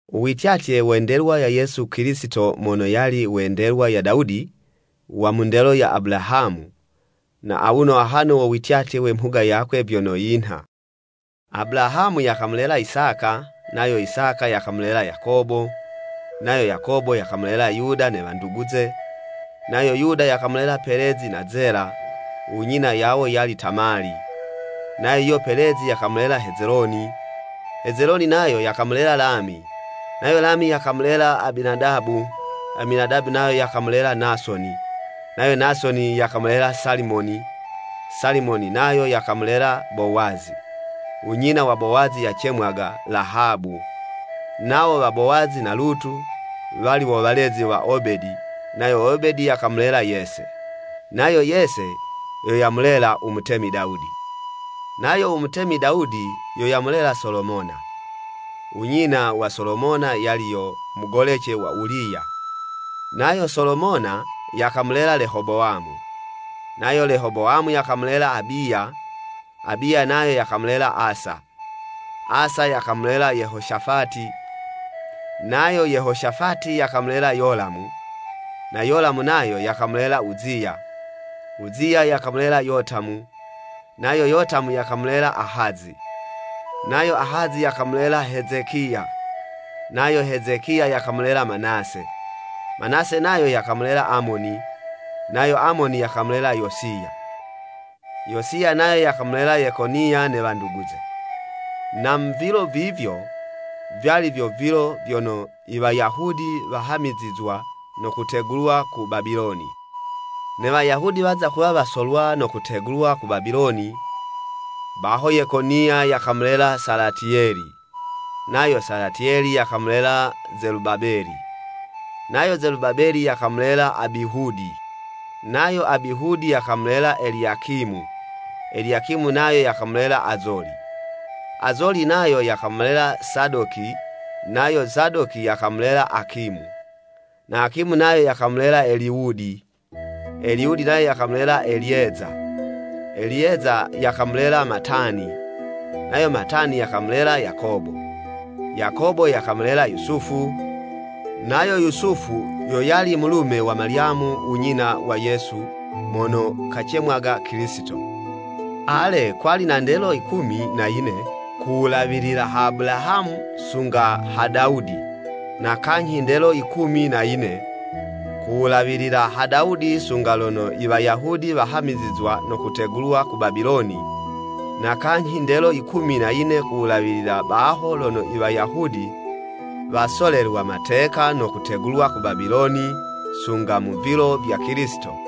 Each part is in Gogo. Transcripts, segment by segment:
U wityatye we ndelwa ya Yesu Kilisito mono yali we ndelwa ya Dawudi, wa mu ndelo ya Abulahamu. Na awuno ahano wo wityatye we mhuga yakwe vyono yinha. Abulahamu yakamulela Isaka, nayo Isaka yakamulela Yakobo, nayo Yakobo yakamulela Yuda ne wanduguze. Nayo Yuda yakamulela Pelezi na Zela (unyina yawo yali Tamali), nayo yuyo Pelezi yakamulela Hezeloni, Hezeloni nayo yakamulela Lami, nayo Lami yakamulela Aminadabu, Aminadabu nayo yakamulela Nasoni, nayo Nasoni, yakamulela Salimoni, Salimoni nayo yakamulela Bowazi (unyina wa Bowazi yacemwaga Lahabu). Nawo wa Bowazi na Lutu, wali wo walezi wa Obedi, nayo Obedi yakamulela Yese, nayo Yese yo yamulela u mutemi Dawudi. Nayo u mutemi Dawudi, yo yamulela Solomona, (unyina wa Solomona yali yo mugolece wa Uliya). Nayo Solomona yakamulela Lehobowamu, nayo Lehobowamu yakamulela Abiya, Abiya nayo yakamulela Asa, Asa yakamulela Yehoshafati, nayo Yehoshafati yakamulela Yolamu, na Yolamu nayo yakamulela Uziya, Uziya yakamulela Yotamu, nayo Yotamu yakamulela Ahazi, nayo Ahazi yakamulela Hezekiya. Nayo Hezekiya yakamulela Manase, Manase nayo yakamulela Amoni, nayo Amoni yakamulela Yosiya. Yosiya nayo yakamulela Yekoniya, ne wanduguze. Na mu vilo vivyo, vyali vyo vilo vyono i Wayahudi wahamizizwa no kutegulwa ku Babiloni. Ne Wayahudi waza kuwa wasolwa no kutegulwa ku Babiloni, baho Yekoniya yakamulela Salatiyeli, nayo Salatiyeli yakamulela Zelubabeli, nayo Zelubabeli yakamulela Abihudi, nayo Abihudi yakamulela Eliyakimu, Eliyakimu nayo yakamulela Azoli. Azoli nayo yakamulela Sadoki nayo Sadoki yakamulela Akimu, na Akimu nayo yakamulela Eliwudi. Eliwudi nayo yakamulela Eliyeza, Eliyeza yakamulela Matani, nayo Matani yakamulela Yakobo. Yakobo yakamulela Yusufu, nayo Yusufu yo yali mulume wa Malyamu u nyina wa Yesu mono kacemwaga Kilisito. Ale, kwali na ndelo yikumi na yine, ku wulawilila ha Abulahamu sunga ha Dawudi, na kanyhi ndelo yikumi na yine, ku wulawila ha Dawudi sunga lono i Wayahudi wahamizizwa no kutegulwa ku Babiloni, na kanyhi ndelo yikumi na yine ku wulawilila baho lono i Wayahudi wasolelwa mateka no kutegulwa ku Babiloni sunga mu vilo vya Kilisito.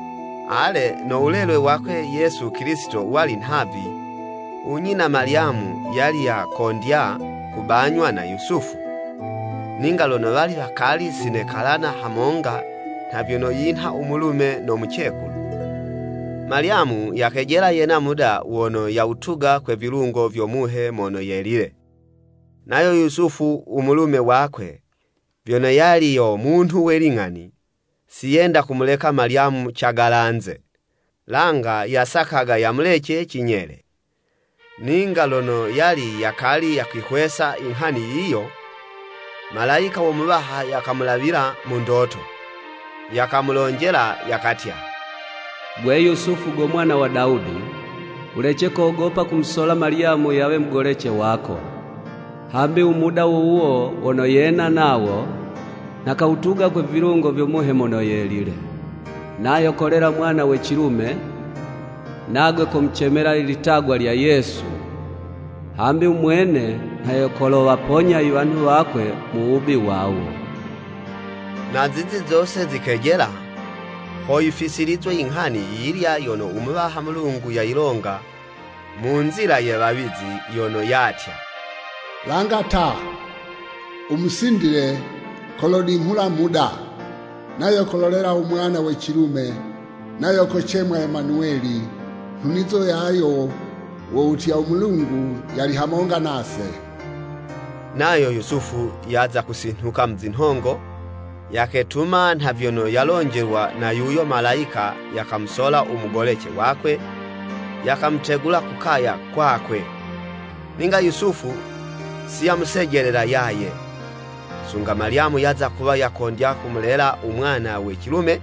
Ale, no wulelwe wakwe Yesu Kilisito wali nhavi. U nyina Malyamu yali yakondya kubanywa na Yusufu. Ninga lono wali wakali si nekalana hamonga nha vyono yinha u mulume no mucekulu, Malyamu yakejela yena muda wono yawutuga kwe vilungo vyo Muhe Mono Yelile. Nayo Yusufu u mulume wakwe, vyono yali yo munhu we ling'ani, si yenda kumuleka Malyamu cagalanze, langa yasakaga yamulece cinyele. Ninga lono yali yakali yakuyihwesa inghani yiyo, malayika wo Muwaha yakamulawila mu ndoto, yakamulonjela, yakatya, “Gwe Yusufu go mwana wa Dawudi, wulece kogopa kumusola Malyamu yawe mugolece wako, hambi u muda wuwo wono yena nawo, nha kawutuga kwe vilungo vyo Muhe Mono Yelile. Nayo kolela mwana we cilume, nagwe komucemela ilitagwa lya Yesu, hambi u mwene nha yo kolowaponya iwanhu wakwe mu wubi wawo.” Na zizi zose zikejela, ho yifisilizwe inghani yiyilya yono u Muwaha Mulungu yayilonga mu nzila ye wawizi, yono yatya, “Langa ta, u musindile kolodinghula muda, nayo kololela u mwana we cilume, nayo kocemwa Emanuweli. Nhunizo yayo wo wutya, ‘U Mulungu yali hamonga nase.'" Nayo Yusufu yaza kusinhuka mu zinhongo, yaketuma nha vyono yalonjelwa na yuyo Malayika yakamusola u mugolece wakwe, yakamutegula ku kaya kwakwe. Ninga Yusufu si yamusejelela yaye, sunga Malyamu yaza kuwa yakondya kumulela u mwana we cilume.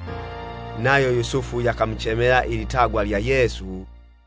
Nayo Yusufu yakamucemela ilitagwa lya Yesu.